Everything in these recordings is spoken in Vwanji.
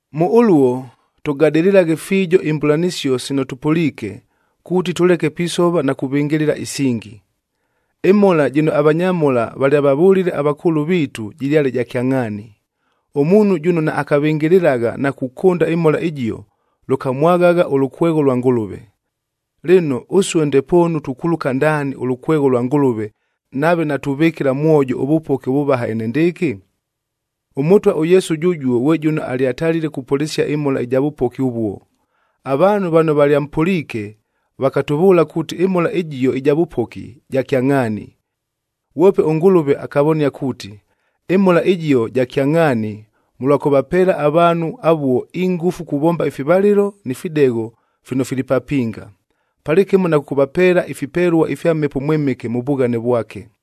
Mʉ ʉluo, tʉgadɨlɨlaghe fiijo imbʉlanɨsio sino tʉpʉliike, kuuti tʉleke pisova na kuvɨngɨlɨla isingi. Ɨmhola jɨno avanyamhola valyavavʉlile avakʉʉlʉ viitu jɨlyale ja kyangʼhaani, ʉmuunhu jʉno naakavɨngɨlɨlagha na kukʉnda ɨmhola ɨjio, lʉkamwaghagha ʉlʉkwegho lwa Ngʉlʉve. Lɨno, ʉsue ndepoonu tukuluka ndaani ʉlʉkwegho lwa Ngʉlʉve, nave natuvɨkɨla mwojo ʉvʉpoki ʉvʉvaha enendɨɨkɨ? ɄMʉtwa ʉYesu jʉjuo ghwe jʉno alyatalile kupʉlɨsia ɨmhola ɨja vʉpoki ʉvuo, avaanhu vano valyampʉliike vakatʉvʉʉla kuuti ɨmhola ɨjio ɨja vʉpoki, ja kyangʼhaani. Ghwope ʉNgʉlʉve akavonia kuuti, ɨmhola ɨjio ja kyangʼhaani mʉlwa kʉvapeela avaanhu avuo ingʉfu kuvomba ifivalɨlo ni fidegho fino fili papinga, palɨkɨmo na kʉkʉvapeela ifipelua ifya Mhepo ʉMwɨmɨke mʉ vughane vwake.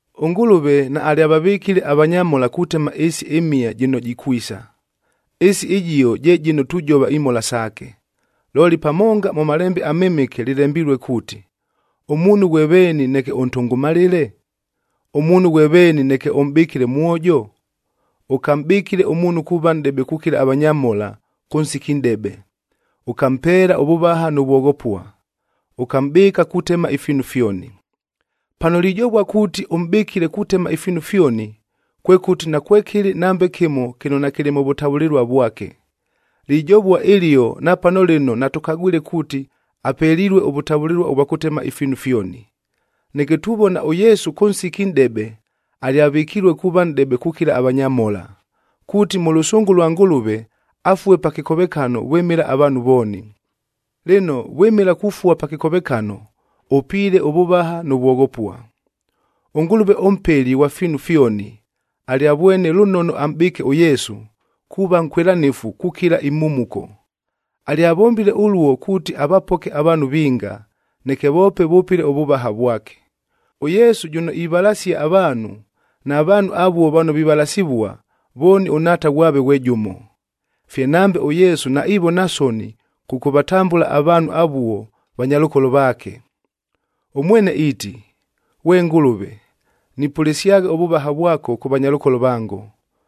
ɄNgʉlʉve naalyavavɨkile avanyamhola kutema ɨɨsi ɨmhia jɨno jikwisa. Ɨɨsi ɨjio je jɨno tujova imhola saake. Looli pamonga mʉ Malembe aMɨmɨke lɨlembilue kuuti, “Ʉmuunhu ghwe veeni neke ʉntʉngʉmalɨle? Ʉmuunhu ghwe veeni neke ʉmʼbɨkɨle ʉmwojo? Ʉkamʼbɨkile ʉmuunhu kuuva nʼdebe kukila avanyamhola kʉ nsiki nʼdebe. Ʉkampeela ʉvʉvaha nʉ vwoghopua, ʉkamʼbɨɨka kutema ifiinu fyoni.”a Pano lijovua kuuti, ʉmʼbɨkile kutema ifiinu fyoni, kwekʉti nakwekɨlɨ nambe kɨmo kɨno nakɨlɨ mʉ vʉtavʉlɨlua vwake. Lijovua ɨlio napano lɨno natʉkagwile kuuti apelilue ʉvʉtavʉlɨlua ʉvwa kʉtema ifiinu fyoni. Neke tuvona ʉYesu kʉ nsiki nʼdebe, alyavɨkilue kuuva nʼdebe kukila avanyamhola, kuuti mʉ lʉsʉngʉ lwa Ngʉlʉve afue pa kɨkovekano vwɨmɨla avaanhu vooni. Lɨno, vwɨmɨla kufua pa kɨkovekano, ʉpiile ʉvʉvaha nʉ vwoghopua. ɄNgʉlʉve ʉMpeli ghwa fiinu fyoni, alyavwene lʉnono amʼbɨɨke ʉYesu, kuuva nkwɨlanɨfu kukilila imhumuko. Alyavombile ʉluo kuuti avapoke avaanhu vinga, neke voope vʉpɨle ʉvʉvaha vwake. ɄYesu jʉno ivalasia avaanhu, na vaanhu avuo vano vivalasivua, vooni ʉNhaata ghwave ghwe jʉmo. Fye nambe ʉYesu naivona soni kʉkʉvatambʉla avaanhu avuo vanyalʉkolo vaake. Ʉmwene iiti, “Ghwe Ngʉlʉve, nipʉlɨsyagha ʉvʉvaha vwako kʉ vanyalʉkolo vango,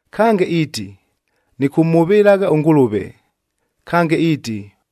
Kange iiti, “Nɨkʉmhʉvɨlagha ʉNgʉlʉve.”c Kange iiti,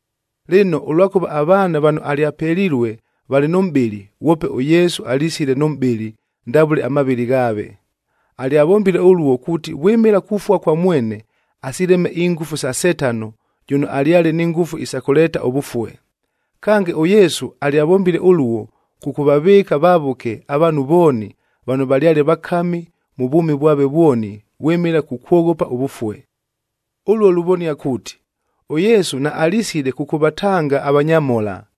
Lɨno, ʉlwakʉva avaana vano alyapelilue valɨ nʉ mʼbɨlɨ, ghwope ʉYesu alisile nʉ mʼbɨlɨ ndavʉle amavɨlɨ ghaave. Alyavombile ʉluo kuuti vwɨmɨla kufua kwa mwene, asileme ingʉfu sa Setano jʉno alyale ni ngʉfu isa kʉleeta ʉvʉfue. Kange, ʉYesu alyavombile ʉluo, kʉkʉvavɨɨka vavʉke avaanhu vooni vano valyale vakami mʉ vwʉmi vwave vwoni vwɨmɨla kukwoghopa ʉvʉfue. Ʉluo luvonia kuuti, ʉYesu naalisile kʉkʉvatanga avanyamhola,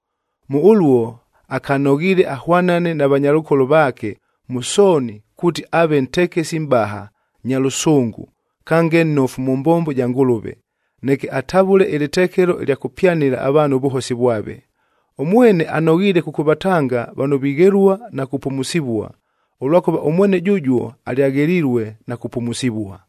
Mʉ ʉluo akanoghiile ahwanane na vanyalʉkolo vaake mʉ sooni kuuti aave ntekesi mʼbaha,f nya lʉsʉngʉ, kange nnofu mʉ mbombo ja Ngʉlʉve, neke atavʉle ɨlɨtekelo ɨlya kʉpyanɨla avaanhu ʉvʉhosi vwave. Ʉmwene anoghiile kʉkʉvatanga vano vighelua na kupumusivua, ʉlwakʉva ʉmwene jʉjuo alyaghelilue na kupumusivua.